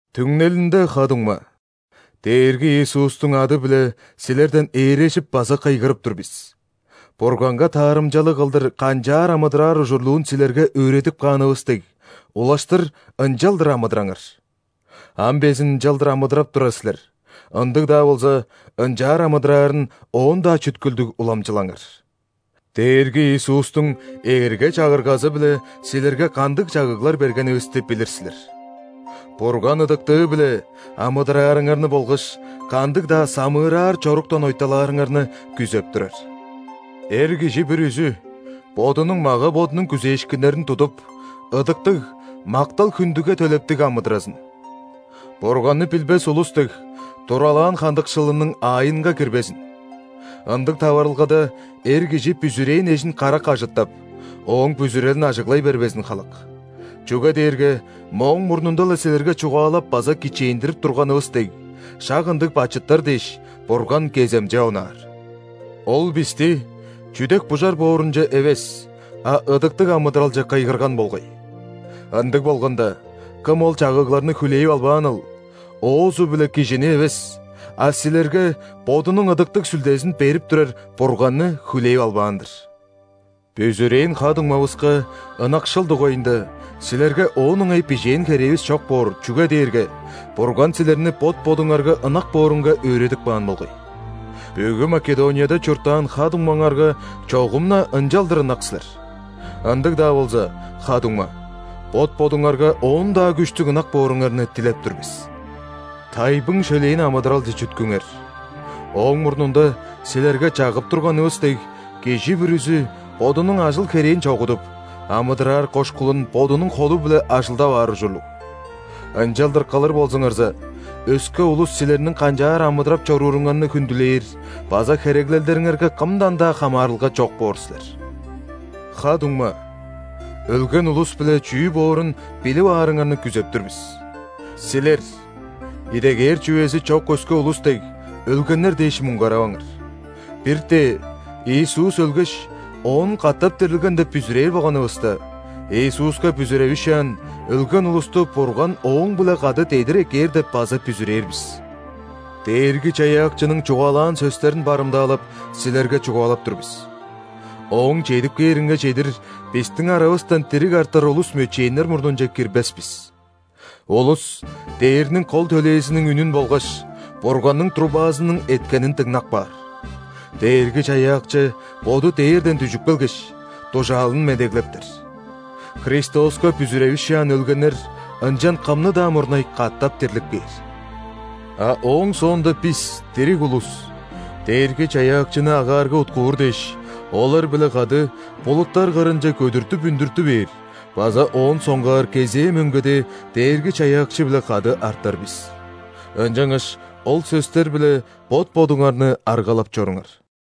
Түңнелинде, ха-дуңма, Дээрги Иисустуң ады-биле силерден ээрежип база кыйгырып тур бис: Бурганга таарымчалыг кылдыр канчаар амыдыраар ужурлуун силерге өөредип каанывыс дег, улаштыр ынчалдыр амыдыраңар. Ам безин ынчалдыр амыдырап турар силер, ындыг-даа болза, ынчаар амыдыраарын оон-даа чүткүлдүг уламчылаңар. Дээрги Иисустуң эрге-чагыргазы-биле силерге кандыг чагыглар бергенивисти билир силер. Бурган ыдыктыы-биле амыдыраарыңарны болгаш кандыг-даа самыыраар чоруктан ойталаарыңарны күзеп турар. Эр кижи бүрүзү бодунуң мага-бодунуң күзээшкиннерин тудуп, ыдыктыг, мактал-хүндүге төлептиг амыдыразын. Бурганны билбес улус дег, туралаан хандыкшылының аайынга кирбезин. Ындыг таварылгада эр кижи бүзүрээн эжин карак ажыттап, ооң бүзүрелин ажыглай бербезин халак. Чүге дээрге мооң мурнунда-ла силерге чугаалап база кичээндирип турганывыс дег, шак ындыг бачыттар дээш, Бурган кеземче онаар. Ол бисти чүдек-бужар боорунче эвес, а ыдыктыг амыдыралче кыйгырган болгай. Ындыг болганда, кым ол чагыгларны хүлээп албааныл, оозу-биле кижини эвес, а силерге Бодунуң Ыдыктыг Сүлдезин берип турар Бурганны хүлээп албаан-дыр. Бүзүрээн ха-дуңмавыска ынакшыл дугайында силерге оон ыңай бижээн херээвис чок боор, чүге дээрге Бурган силерни бот-бодуңарга ынак боорунга өөредип каан болгай. Бүгү Македонияда чурттаан ха-дуңмаңарга чогум-на ынчалдыр ынак силер. Ындыг-даа болза, ха-дуңма, бот-бодуңарга оон-даа күштүг ынак бооруңарны дилеп тур бис. Тайбың-шөлээн амыдыралче чүткүңер, ооң мурнунда силерге чагып турганывыс дег, кижи бүрүзү бодунуң ажыл-херээн чогудуп, амыдыраар кошкулун бодунуң холу-биле ажылдап аар ужурлуг. Ынчалдыр кылыр болзуңарза, өске улус силерниң канчаар амыдырап чорууруңарны хүндүлээр база хереглелдериңерге кымдан-даа хамаарылга чок боор силер. Ха-дуңма, өлген улус-биле чүү боорун билип аарыңарны күзеп тур бис. Силер, идегээр чүвези чок өске улус дег, өлгеннер дээш муңгараваңар. Бир-тээ, Иисус өлгеш, оон катап дирилген деп бүзүрээр болганывыста, Иисуска бүзүревишаан өлген улусту Бурган Ооң-биле кады дедир эккээр деп база бүзүрээр бис. Дээрги-Чаяакчының чугаалаан сөстерин барымдаалап, силерге чугаалап тур бис: Ооң чедип кээринге чедир бистиң аравыстан дириг артар улус мөчээннер мурнунче кирбес бис. Улус дээрниң кол төлээзиниң үнүн болгаш Бурганның трубазының эткенин дыңнап каар. Дээрги-Чаяакчы Боду дээрден дүжүп келгеш, дужаалын медеглептер. Христоска бүзүревишаан өлгеннер ынчан кымны-даа мурнай катап дирлип кээр. А ооң соонда бис, дириг улус, Дээрги-Чаяакчыны агаарга уткуур дээш, олар-биле кады булуттар кырынче көдүртүп үндүртү бээр база оон соңгаар кезээ мөңгеде Дээрги-Чаяакчы-биле кады артар бис. Ынчангаш ол сөстер-биле бот-бодуңарны аргалап чоруңар.